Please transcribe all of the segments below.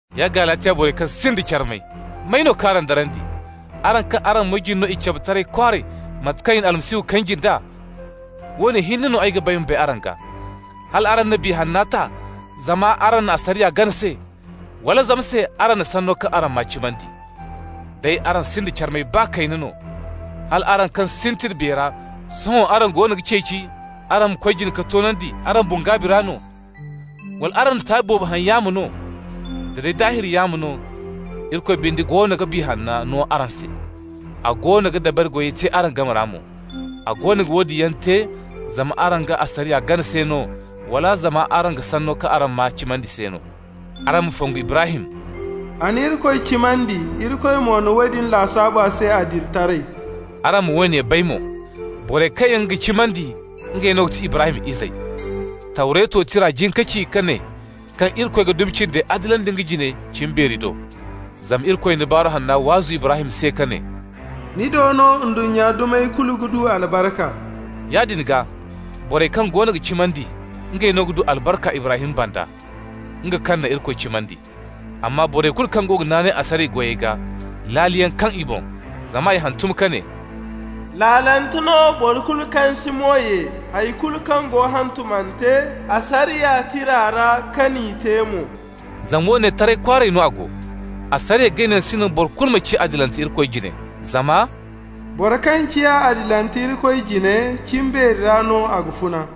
Ya Galatiya borey kaŋ sinda carmay, may no k'araŋ darandi, araŋ kaŋ araŋ moy jine no i cabe taray kwaaray mate kaŋ i na Yesu Almasihu kanji nd'a? Woone hinne no ay ga ba ay ma bay araŋ gaa: hala araŋ na Biya Hanna ta zama araŋ na asariya gana se, wala zama se araŋ na sanno kaŋ araŋ maa cimandi? Day araŋ sinda carmay baa kayna no, hal araŋ kaŋ sintin Biya ra, sohõ araŋ goono ga ceeci araŋ ma koy jina ka toonandi araŋ boŋ gaabi ra no? Wala araŋ na taabi boobo haŋ yaamo no? Da day daahir yaamo no! Irikoy binde goono ga Biya Hanna no araŋ se, a goono ga dabari goyey te araŋ game ra mo. A goono ga woodin yaŋ te zama araŋ ga asariya gana se no, wala zama araŋ ga sanno kaŋ araŋ maa cimandi se no? Araŋ ma fongu Ibrahim: «A na Irikoy cimandi, Irikoy mo na woodin lasaabu a se adilitaray.» Araŋ ma woone bay mo: borey kaŋ yaŋ ga cimandi, ngey no ga ti Ibrahim izey. Tawreto Tira jin ka ci ka ne kaŋ Irikoy ga dumi cindey adilandi nga jine cimbeeri do. Zama Irikoy na Baaru Hanna waazu Ibrahim se ka ne: «Ni do no ndunnya dumey kulu ga du albarka.» Yaadin gaa borey kaŋ goono ga cimandi, ngey no ga du albarka Ibrahim banda, nga kaŋ na Irikoy cimandi. Amma borey kulu kaŋ ga naanay asariya goyey gaa, laaliyaŋ kaŋ i boŋ, zama i hantum ka ne: «Laalante no boro kulu kaŋ si mo ye hay kulu kaŋ go hantumante asariya tira ra, ka n'i te mo.» Zama woone, taray kwaaray no a go: asariya ganayaŋ si naŋ boro kulu ma ciya adilante Irikoy jine, zama «boro kaŋ ciya adilante Irikoy jine, cimbeeri ra no a ga funa.»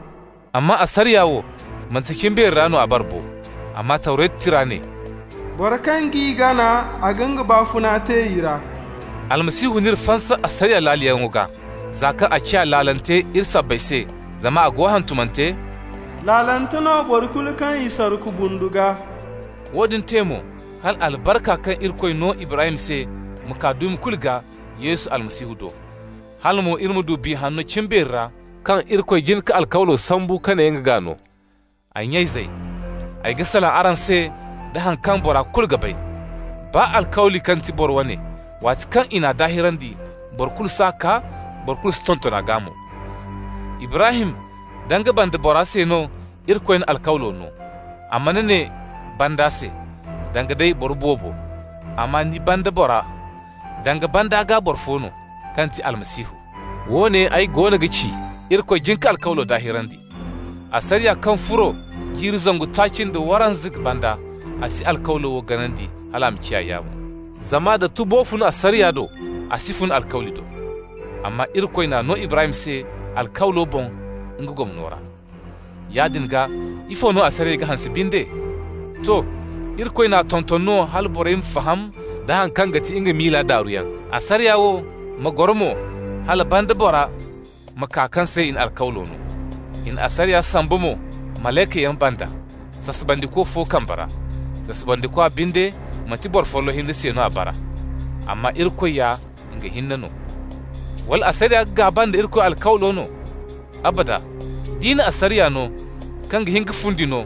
Amma asariya wo, manti cimbeeri ra no a bara bo. Amma Tawretu Tira ne: «Boro kaŋ g'i gana, a ga nga baafuna te i ra.» Almasihu n'iri fansa asariya laaliyaŋo gaa, za kaŋ a ciya laalante iri sabbay se. Zama a go hantumante: «Laalante no boro kulu kaŋ i sarku bundu gaa.» Woodin te mo hala albarka kaŋ Irikoy no Ibrahim se ma kaa dumi kulu gaa Yesu Almasihu do, hala mo iri ma du Biya Hanno cimbeeri ra, kaŋ Irikoy jin ka alkawli sambu ka ne nga ga no. Ay nya-izey, ay ga salaŋ araŋ se da haŋ kaŋ bora kulu ga bay: baa alkawli kaŋ ti boro wane, waati kaŋ i n'a daahirandi, boro kulu s'a kaa, boro kulu si tonton a gaa mo. Ibrahim da nga banda bora se no Irikoy na alkawlo no. A mana ne: «banda se», danga day boro boobo, amma «ni banda bora», danga banda gaa boro fo no, kaŋ ga ti Almasihu. Woone ay goono ga ci: Irikoy jin ka alkawlo daahirandi. Asariya kaŋ furo jiiri zangu taaci nda waranza banda, a si alkawlo wo ganandi, hal a ma ciya yaamo. Zama nda tubo fun asariya do, a si fun alkawli do. Amma Irikoy n'a no Ibrahim se alkawlo boŋ nga gomno ra. Yaadin gaa, ifo no asariya ga hanse binde? To. Irikoy n'a tonton no hala borey ma faham da haŋ kaŋ ga ti nga miila daaruyaŋ. Asariya wo ma goro mo hala banda bora ma kaa kaŋ se i na alkawlo no. I na asariya samba mo malaykayaŋ banda, sasabandiko fo kambe ra. Sasabandikwa binde, manti boro folloŋ hinne se no a bara. Amma Irikoy ya nga hinne no. Wala asariya ga gaaba nda Irikoy alkawlo no? Abada! D'i na asariya no kaŋ ga hin ka fundi no,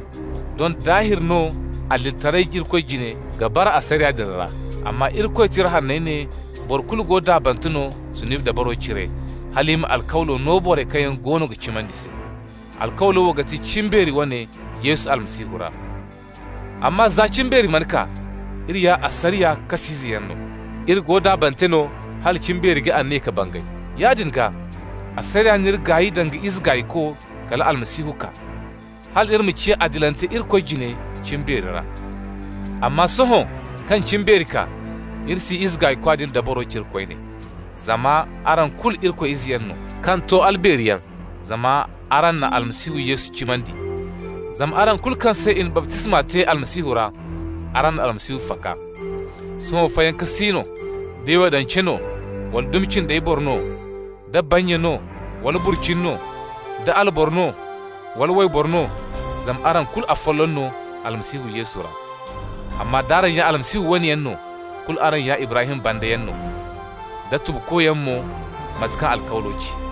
doŋ daahir no adilitaray Irikoy jine ga bara asariya din ra. Amma Irikoy Tira Hanney ne boro kulu go daabante no zunubi dabaro cire, hal i ma alkawlo no borey kaŋ yaŋ goono ga cimandi se. Alkawlo wo ga ti cimbeeri wane Yesu Almasihu ra. Amma za cimbeeri mana kaa, iri ya asariya kas'izeyaŋ no. Iri go daabante no hala cimbeeri ga aniya ka bangay. Yaadin gaa, asariya n'iri gaay danga ize gaayko kala Almasihu kaa, hal iri ma ciya adilante Irikoy jine cimbeeri ra. Amma sohõ kaŋ cimbeeri kaa, iri si ize gaaykwa din dabaro cire koyne. Zama araŋ kulu Irikoy izeyaŋ no, kaŋ to albeeriyaŋ, zama araŋ na Almasihu Yesu cimandi. Zama araŋ kulu kaŋ se i na baptisma te Almasihu ra, araŋ na Almasihu faka. Sohõ fayanka si no: da Yahudance no, wala dumi cindey boro no, da bannya no wala burcini no, da alboro no wala wayboro no, zama araŋ kulu afolloŋ no Almasihu Yesu ra. Amma d'araŋ ya Almasihu wane yaŋ no, kulu araŋ ya Ibrahim bandayaŋ no, da tubukoyaŋ mo, mate kaŋ alkawlo ci.